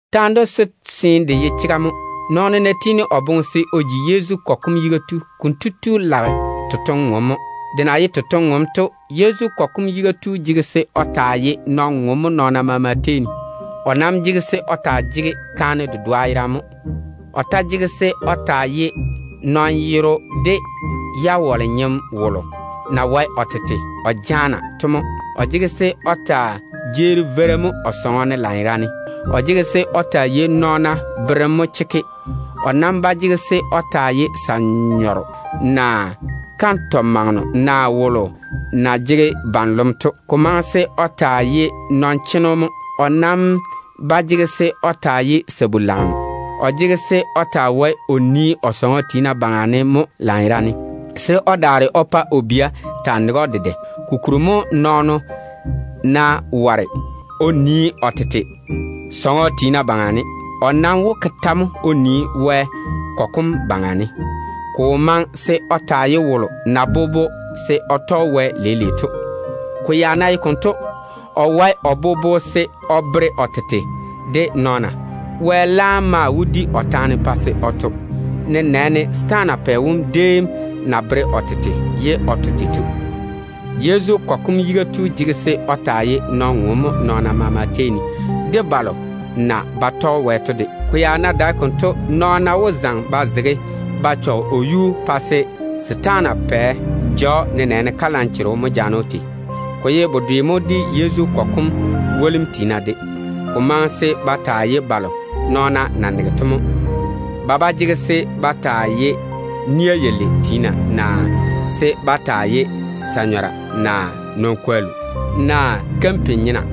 Taane dento seene de ye chega mo: “Nɔɔno boboŋa ná jaane se o ji Yezu kɔgɔ kom yiga tu, konto tu lage totoŋ-ŋom mo.” Konto ŋwaane, Yezu kɔgɔ kom yiga tu jege se o taa ye nɔn-ŋom mo nɔɔna maama tei ne. O nam jege se o taa jege kaane dedoa yerane mo. O ta jege se o taa ye nɔn-yero, de jawale-nyeno wolo na wae o tete o jaana to mo. O jege se o taa jeeri veira mo o sɔŋɔ ne lanyerane. O jege se o taa yei nɔɔna berem mo chekke. O nam ba jege se o taa ye sa-nyɔro, naa kantɔ-mageno, naa wolo na jege ban-lom to. Ko maŋe se o taa ye nɔn-cheno mo. O nam ba jege se o taa ye sabu-lageno. O jege se o taa wae o nii o sɔŋɔ tiina baŋa ne mo lanyerane, se o daare o pa o bia taa nege‑o dedɛ. Kokuri mo nɔɔno ná ware o nii o tete sɔŋɔ tiina baŋa ne, o nam wó ke tɛ mo o nii Wɛ kɔgɔ kom baŋa ne? Ko wo maŋe se o taa ye wolo na bobo se o tɔge Wɛ leile to. Ko ya ná ye konto, o wae o bobo se o bere o tete kamunim. Wɛ laam maa wó di o taane pa se o to, nenɛɛne setaana pɛ wom déem na bere o tete ye o to tei to. Yezu kɔgɔ kom yiga tu jege se o taa ye nɔn-ŋom mo nɔɔna maama tei ne, de balo na ba tɔge Wɛ to de tei ne. Ko ya ná dae konto, nɔɔna wó wane ba yaale o yuu pa se setaana pɛ ja‑o, nenɛɛne kalanchogo mo jaane‑o tei. Ko ye bedwe mo de Yezu kɔgɔ kom wolim tiina de. Ko maŋe se ba taa ye balo nɔɔna na nege to mo. Ko dae se ba taa jege ni-zɛ ni-zɛ, naa se ba taa ye sa-nyɔra, naa nɔn-kwollu, naa kampin-nyena.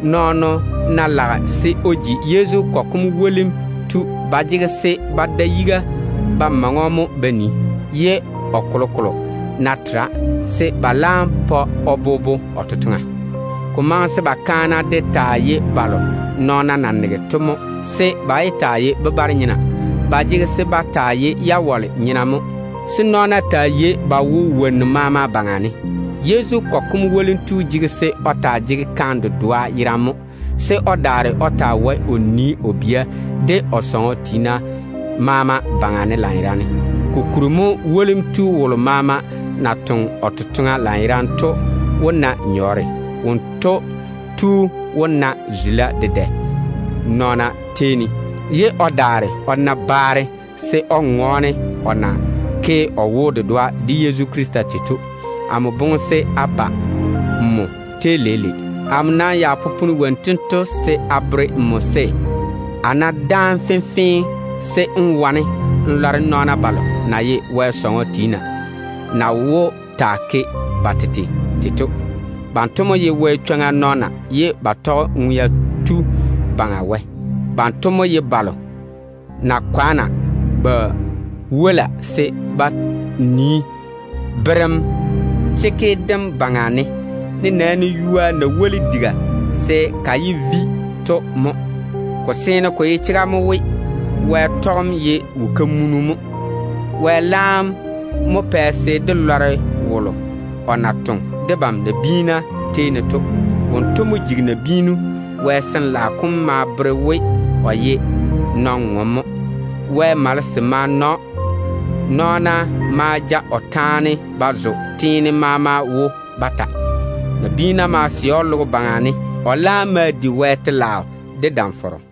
Nɔɔno ná lage se o ji Yezu kɔgɔ kom wolim tu, ba jege se ba da yiga ba maŋe‑o mo ba nii, ye o kolokolo ná tera, se ba laam pa o bobo o totoŋa. Ko maŋe se ba kaana ba kaana naa wolim tiina balo na ye kaana to de taa ye balo nɔɔna na nege to mo, se ba yé taa ye bebare-nyena. Ba jege se ba taa ye jawale-nyena mo, se nɔɔna taa jege ba chega wonnu maama baŋa ne. Yezu kɔgɔ kom wolim tu jege se o taa jege kaane dedoa yerane mo, se o daare o taa wae o nii o bia de o sɔŋɔ tiina maama baŋa ne lanyerane. Kokuri mo wolim tu wolo maama na toŋe o totoŋa lanyerane to wó na yere. Wonto wó na zula dedɛ nɔɔna tei ne, ye o daare o na baare de o na ke o wo-dedoa de Yezu Krista tei to. Amo boŋe se a ba nmo tei leile. Amo nam popone wonnu tento se a bere nmo se, a ná dáane fenfee, se n wane n lɔre nɔɔna balo na ye Wɛ sɔŋɔ tiina to na wó taa jege ba tete tei to. Banto mo ye Ŋwea Tu Baŋa Wɛ kɔgɔ kom nɔɔna. Banto mo ye balo na fɔge ba nii Wɛ chega kam baŋa ne, nenɛɛne ywoa na woli diga se ka yé vi to mo. Ko seene ko ye chega mo we, Wɛ tɔgem ye wo-kamunu mo. Wɛ laam mo pɛ se dé lɔre wolo o na toŋe debam nabiina tei ne to: Wonto mo jigi nabiinu. Wɛ Sin-laao kom ma bere we o jege chega. Wɛ malese ma na‑o. Nɔɔna ma ja o kwora ba zo teene maama wo ba tɔɔle. Nabiina ma sɛ‑o logo baŋa ne. O laam ma di Wɛ telaao de nenɔŋ-fɔrɔ.